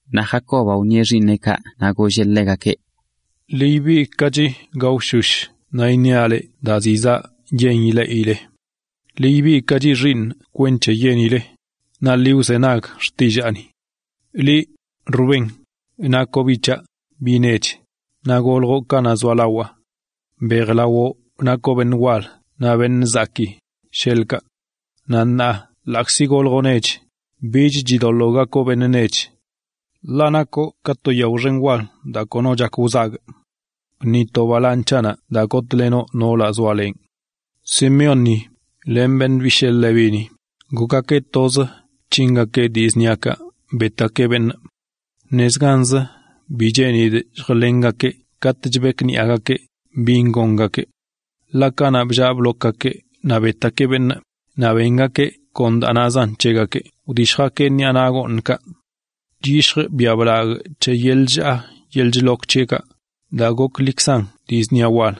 Naꞌ Jacobaꞌ wṉieꞌ xiiṉeꞌkaꞌ naꞌ golleꞌ ḻegakeꞌ: “Ḻi ibigꞌkachi gaoshosh naꞌ iṉiaꞌ leꞌ daa zizaꞌ yen ileꞌile. ’Ḻi ibigꞌkachi xiiṉꞌ kwenc̱he yenile, naꞌ ḻi wzenag xtillaani. ’Liꞌ, Rubén, nakoꞌ biꞌ c̱haꞌ, biꞌ nech, naꞌ goljoꞌ kanaꞌ zoalawaa. Mbejlawoꞌ nakoꞌ beṉꞌ wal naꞌ beṉꞌ zakii, sheḻꞌkaꞌ. Naꞌ ṉaa, ḻaꞌkzi goljoꞌ nech, bich chidoḻoo gakoꞌ beṉꞌ nech, ḻaꞌ nakoꞌ ka to yao xen wal daa kono chak wzagꞌ. Bṉitoꞌ balaaṉ c̱haꞌnaꞌ daa benḻeꞌiloꞌ noolaꞌ zoalenꞌ. ’Simeónni len beṉꞌ bishee Levíni gokgakeꞌ toz bc̱hingakeꞌ dii zṉiakaꞌ betgakeꞌ beṉꞌ. ¡Nezganzə bi cheenidꞌ lljlengakee katꞌ chbekniꞌagakeꞌ bin gongakeꞌ! Ḻaꞌ kanaꞌ bllaa blokgakeꞌ naꞌ betgakeꞌ beṉꞌ, naꞌ bengakeꞌ daa nazan c̱hegakeꞌ wdishj bḻaagakeꞌ ṉiꞌa naꞌ gooṉkaꞌ. Chyishjꞌ biaꞌ blagꞌ c̱he yeḻꞌ chllaa yeḻꞌ chlok c̱heꞌkaꞌ, daa goklikzan dii zṉia wal.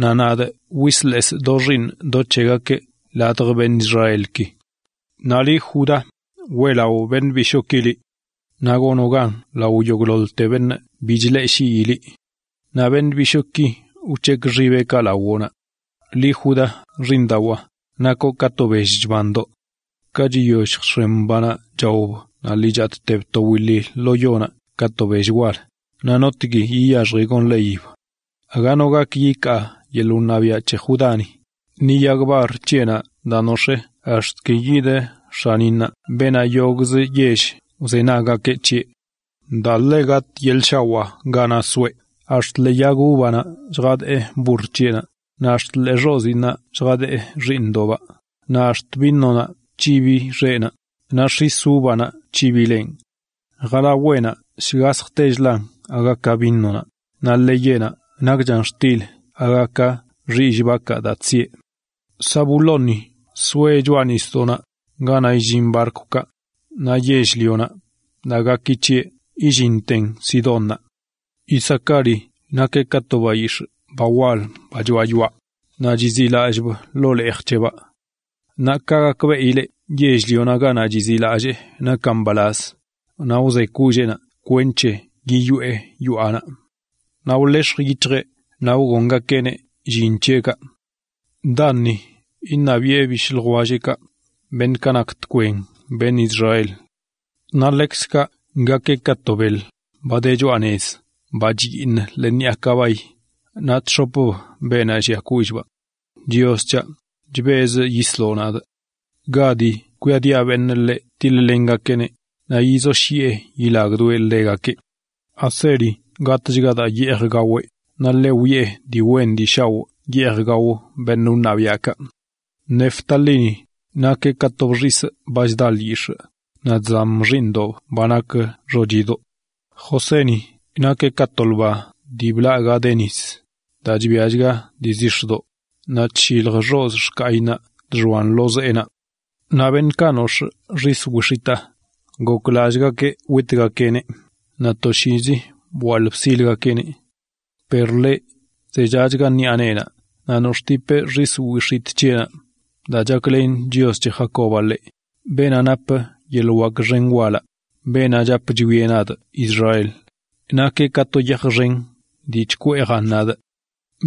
Naꞌ nadꞌ wislesꞌ do xiiṉ do c̱hegakeꞌ ladj beṉꞌ Israelki. ’Naꞌ liꞌ Judá, weꞌlaꞌo beṉꞌ bishooki liꞌ. Naꞌ gonoꞌ gan lao yogꞌḻoḻte beṉꞌ bi chleꞌshii liꞌ. Naꞌ beṉꞌ bishooki wc̱hekꞌ xibeꞌkaꞌ lawoꞌnaꞌ. Liꞌ, Judá, xiiṉdawaa, nakoꞌ ka to bell chbandoꞌ. Ka chiyoll lljx̱em banaꞌ chaob naꞌ lii chatꞌteb to wili lo yonaꞌ ka to bell wal, naꞌ ¿notgui yiyaxji gonḻeyib? Aga no gak yikaa yeḻꞌ wṉabiaꞌ c̱he Judáni, ni yag bar c̱heꞌnaꞌ daa nox̱ee ax̱t ki yid x̱aninnaꞌ beenaꞌ yogꞌzə yell wzenaggakeꞌ c̱heꞌ. Daa ḻe gatꞌ yeḻꞌ shawaa ganaꞌ soeꞌ ax̱t ḻee yag uvanaꞌ lljadee burr c̱heꞌnaꞌ, naꞌ ax̱t ḻee xoziinnaꞌ lljadee xiiṉdoꞌbaꞌ; naꞌ ax̱t vinonaꞌ c̱hibi xeꞌnaꞌ, naꞌ x̱is uvanaꞌ c̱hibileꞌn. Jalaweꞌnaꞌ shgasjtechlan aga ka vinonaꞌ, naꞌ ḻeyeꞌnaꞌ nakchan xtilch aga ka xillꞌ bakaꞌ daa chsieꞌ. ’Zabulóni soeꞌ choꞌa nisdoꞌnaꞌ ganaꞌ illin barkwkaꞌ; naꞌ yell-lionaꞌ daa gaki c̱heꞌ illinten Sidónnaꞌ. ’Isacári nakeꞌ ka to bayix̱ꞌ ba wal ba choaꞌ yoaꞌ, naꞌ chiziꞌlallꞌb ḻoo leej c̱hebaꞌ. Naꞌ ka gakbeꞌileꞌ yell-lionaꞌ ganaꞌ chiziꞌlallee nakan mbalaz, naꞌ wze kolleenaꞌ kwenc̱he yiyoꞌe yoaꞌnaꞌ, naꞌ wlex̱j yic̱hjeꞌ naꞌ wgongakeꞌneꞌ llin c̱heꞌkaꞌ. ’Danni iṉabiꞌe bishꞌ ljwelleꞌkaꞌ, beṉꞌkaꞌ nak tkwen beṉꞌ Israel. Naꞌ ḻekzkaꞌ gakeꞌ ka to beḻ, ba de choꞌa nez ba chbaꞌo ḻee ṉiꞌa kabay naꞌ chx̱opb beenaꞌ llia kollꞌbaꞌ. ’¡Chios c̱haꞌ, chbezꞌ yisloꞌ nadꞌ! ’Gadi kwiadiꞌa beṉꞌ ḻeꞌ tiḻ-lengakeꞌneꞌ, naꞌ yizoshyiꞌe yilagdoeꞌ ḻegakeꞌ. ’Aseri gatꞌchga daa yeej gaweꞌ; naꞌ ḻeꞌ wiꞌe dii wen dii shaoꞌ yeej gao beṉꞌ wṉabiaꞌkaꞌ. ’Neftalíni, nakeꞌ ka to bxisꞌ ba chda lyix̱ꞌ, naꞌ chzam xiiṉdob ba nak xochidoꞌ. ’Joséni nakeꞌ ka to lba dii blaꞌ ga de nis, daa chbiachga dii zix̱doꞌ, naꞌ chllilj xozꞌ xkayinnaꞌ chxoan lo zeenaꞌ. Naꞌ beṉꞌkaꞌ nox̱ꞌ xis wix̱itaa goklallꞌgakeꞌ witgakeꞌneꞌ, naꞌ toshiizi bwaḻꞌ bsilgakeꞌneꞌ. Per ḻeꞌ zechachga ṉiꞌa neenaꞌ naꞌ nox̱ꞌtipeꞌ xis wix̱itꞌ c̱heꞌnaꞌ daa chaklen Chios c̱he Jacobaꞌ ḻeꞌ, beenaꞌ napə yeḻꞌ wak xen walaꞌ, beenaꞌ chap chwieꞌ nadꞌ Israel, nakeꞌ kaꞌ to yaj xen dii chkweejan nadꞌ.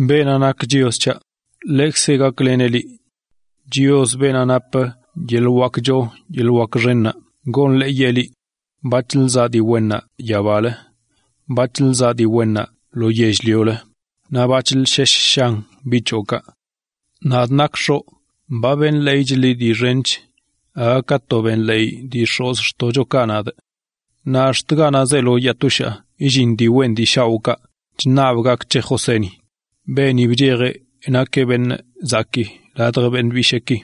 Beenaꞌ nak Chios c̱haꞌ, ḻekzeꞌ gakleneꞌ liꞌ. Chios, beenaꞌ napə yeḻꞌ wak choo yeḻꞌ wak xennaꞌ goneꞌ ka gak wen c̱hoꞌ. Bac̱hlə zaꞌ dii wennaꞌ yabalə, bac̱hlə zaꞌ dii wennaꞌ ḻoo nisaꞌ, naꞌ bac̱hlə shesh shan biꞌ c̱hoꞌkaꞌ. Nadꞌ nakꞌ x̱oꞌ dii xench ba wṉabꞌ gak wen c̱hoꞌ aga ka to daa wṉab dii x̱ozxtoꞌchokaꞌ c̱haꞌ. Naꞌ ax̱t ganaꞌ zeelo yaa toshaa yillin dii wen dii shaoꞌkaꞌ chṉabꞌ gak c̱he Joséni, beeni bchej nakeꞌ beṉꞌ zakii ladj beṉꞌ bisheeki.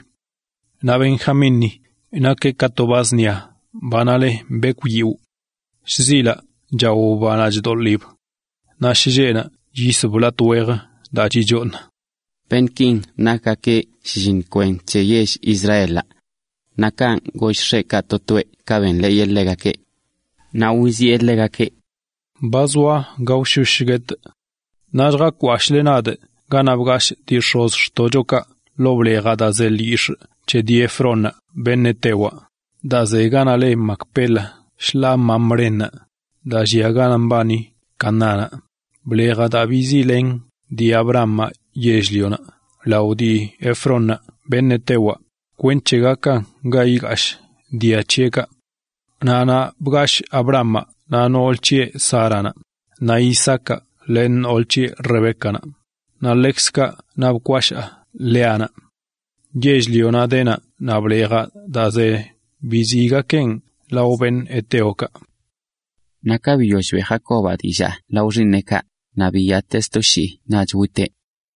’Naꞌ Benjamínni nakeꞌ ka to ba zṉia banaꞌ le bekwꞌyiwꞌ. a Shzilaꞌ() chaob banaꞌ chdoḻib naꞌ shlleꞌnaꞌ chyisb latꞌ wejə daa chichooṉan. Beṉꞌkin nakgakeꞌ shlliṉ kwen c̱he yell Israelaꞌ. Naꞌ kanꞌ goll x̱eꞌkaꞌ to toeꞌ ka wṉabeꞌ gak wen c̱hegakeꞌ. Naꞌ wiziꞌe ḻegakeꞌ: “Ba zoa gaoshosh guetꞌ. Naꞌ lljakwashꞌle nadꞌ ganaꞌ bgashꞌ dii x̱ozxtoꞌchokaꞌ ḻoo blejaꞌ daa ze lo yell-lio c̱he dii Efrónnaꞌ beṉꞌ hetewaꞌ, daa ze ganaꞌ le Macpela shḻaa Mamrénaꞌ, daa llia ganaꞌ mbani Canaánnaꞌ, blejaꞌ daa biziꞌlen dii Abrahamaꞌ yell-lionaꞌ lao dii Efrónnaꞌ beṉꞌ hetewaꞌ, kwenc̱he gakan ga igashꞌ dia c̱heꞌkaꞌ. Naꞌ naꞌ bgashꞌ Abrahamaꞌ naꞌ noolə c̱heꞌ Sáranaꞌ, naꞌ Isaacaꞌ len noolə c̱heꞌ Rebécanaꞌ, naꞌ ḻekzkaꞌ naꞌ bkwashaa Léanaꞌ. Yell-lionaꞌ de naꞌ, naꞌ blejaꞌ daa ze naꞌ, biziꞌgakeꞌn lao heteokaꞌ, Naꞌ ka biyoll beꞌ Jacobaꞌ dillaa lao xiiṉeꞌkaꞌ, naꞌ biyatee sto shii naꞌch witeꞌ.